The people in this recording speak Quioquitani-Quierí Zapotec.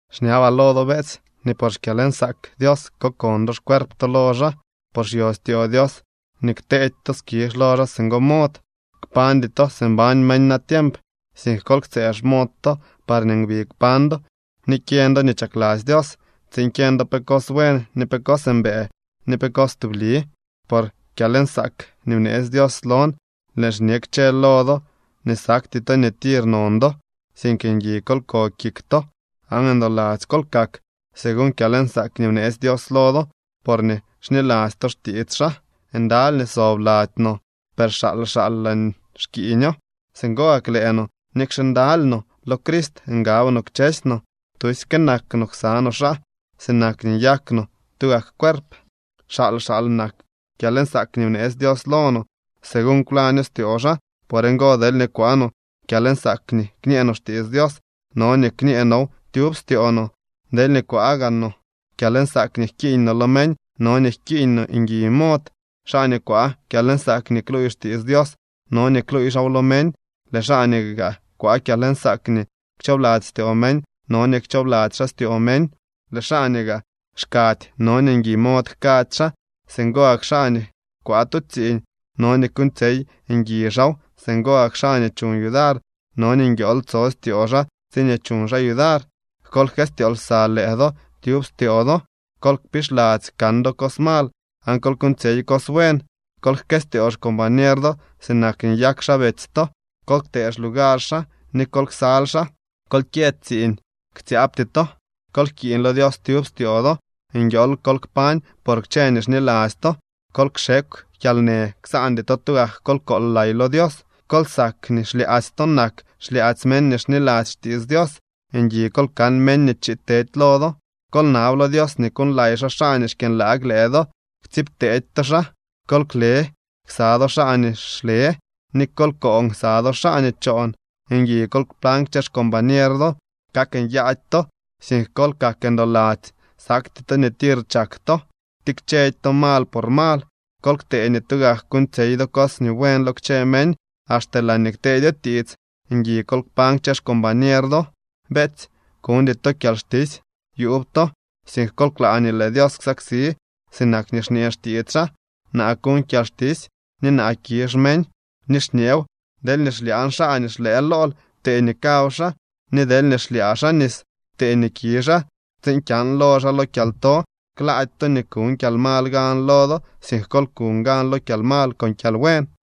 Xñabaa lo do, beetsy, nii por xkyalnsaak Dios kokon do xcuerp to lo xaa. Por xyo styoo Dios nii kteedy to skizh lo xaa singo mod. Kpañdy to si mbañ meñ natiemp, sink kol ktsëë xmod to parñee ngui kpañ do ni kyeñ do nii chakladzy Dios, tsiin kyeñ do pe cos buen, ni pe cos mbëë, ni pe cos tubli. Por kyalnsaak nii bneetsy Dios lon, lëën xñe kchë lo do nii sakty to nii tir non do, sink ngui kol ko kik to aan ndoladzy kol kak, según kyalnsaak nii bneetsy Dios lo do porñee xniladzy to xtiits xaa. Ndaly nii sob lady no, per xaal xaal laa xkiiño. Singo gak lëë no, nikxe ndaly no, lo Crist ngab no kchësy no. Tusyke nak no ksa no xaa, sinak nii nyak no tugak cuerp. Xaal xaal nak kyalnsaak nii bneetsy Dios lo no, según kwlaño styoo xaa. Por ngo, deelñee kwaa no kyalnsaak nii kñee no xtiits Dios, no nii kñee now tyub styoo no. Deelñee kwaa gaa no kyalnsaak nii jkiiñ no lo meñ, no nii jkiiñ no ngui mod. Xaa nii kwaa kyalnsaak nii kluuy xtiits Dios, no nii kluuy xaaw lo meñ. Lëë xaa nii gaa kwaa kyalnsaak nii kchoobladzy styoo meñ, no nii kchoobladzy xaa styoo meñ. Lëë xaa nii gaa xkady, no nii ngui mod jkady xaa. Singo gak xaa nii kwaa tu tsiiñ, no nii kuuñtsyey ngui xaaw. Singo gak xaa nii chuñ yudar, no nii nguiool tso styoo xaa tsiñee chuñ xaa yudar. Kol jkëstyoo lsa lëë do tyub styoo do. Kol kpixladzy kan do cos mal aan kol kuuñtsyey cos buen. Kol jkëstyoo xcombañer do sinak nii nyak xaa betsy to. Kol ktee xlugar xaa ni kol ksal xaa. Kol kyë tsiiñ, ktsyaabty to. Kol jkiiñ lo Dios tyub styoo do. Nguiool kol kpañ por kchë nii xniladzy to. Kol kxekw kyalnë. Ksaandy to tugak kol kool lay lo Dios. Kol sak nii xlyaadzy to nak xlyaadzy meñ nii xniladzy xtiits Dios. Ngui kol kan meñ nii chiid tedy lo do. Kol nab lo Dios nii kuuñlay xaa xaa nii xkyënlaag lëë do. Ktsiibtedy to xaa. Kol kle ksa do xaa nii xle, ni kol koon ksa do xaa nii choon. Ngui kol kpañ kchë xcombañer do. Kak nyaady to, sink kol kak ndoladzy. Sakty to nii tir chak to. Ktikchedy to mal por mal. Kol ktee nii tugak kuuñtsyey do cos nii buen lo kchë meñ. Axte laañee kteedyo tiits, ngui kol kpañ kchë xcombañer do. Beetsy, kuñdy to kyalxtisy yuub to, sink kol klaa nii lëë Dios ksaksi, sinak nii xñee xtiits xaa: “Naa kuñ kyalxtisy ni naa kizh meñ.” Ni xñeew: “Deelñee xlyaañ xaa nii xlëë lool, ptee nii kaw xaa. Ni deelñee xlyaa xaa nis, ptee nii ki xaa, tsiin kyan lo xaa lo kyalto.” Klaady to nii kuñ kyalmal gan lo do, sink kol kuñ gan lo kyalmal con kyalbuen.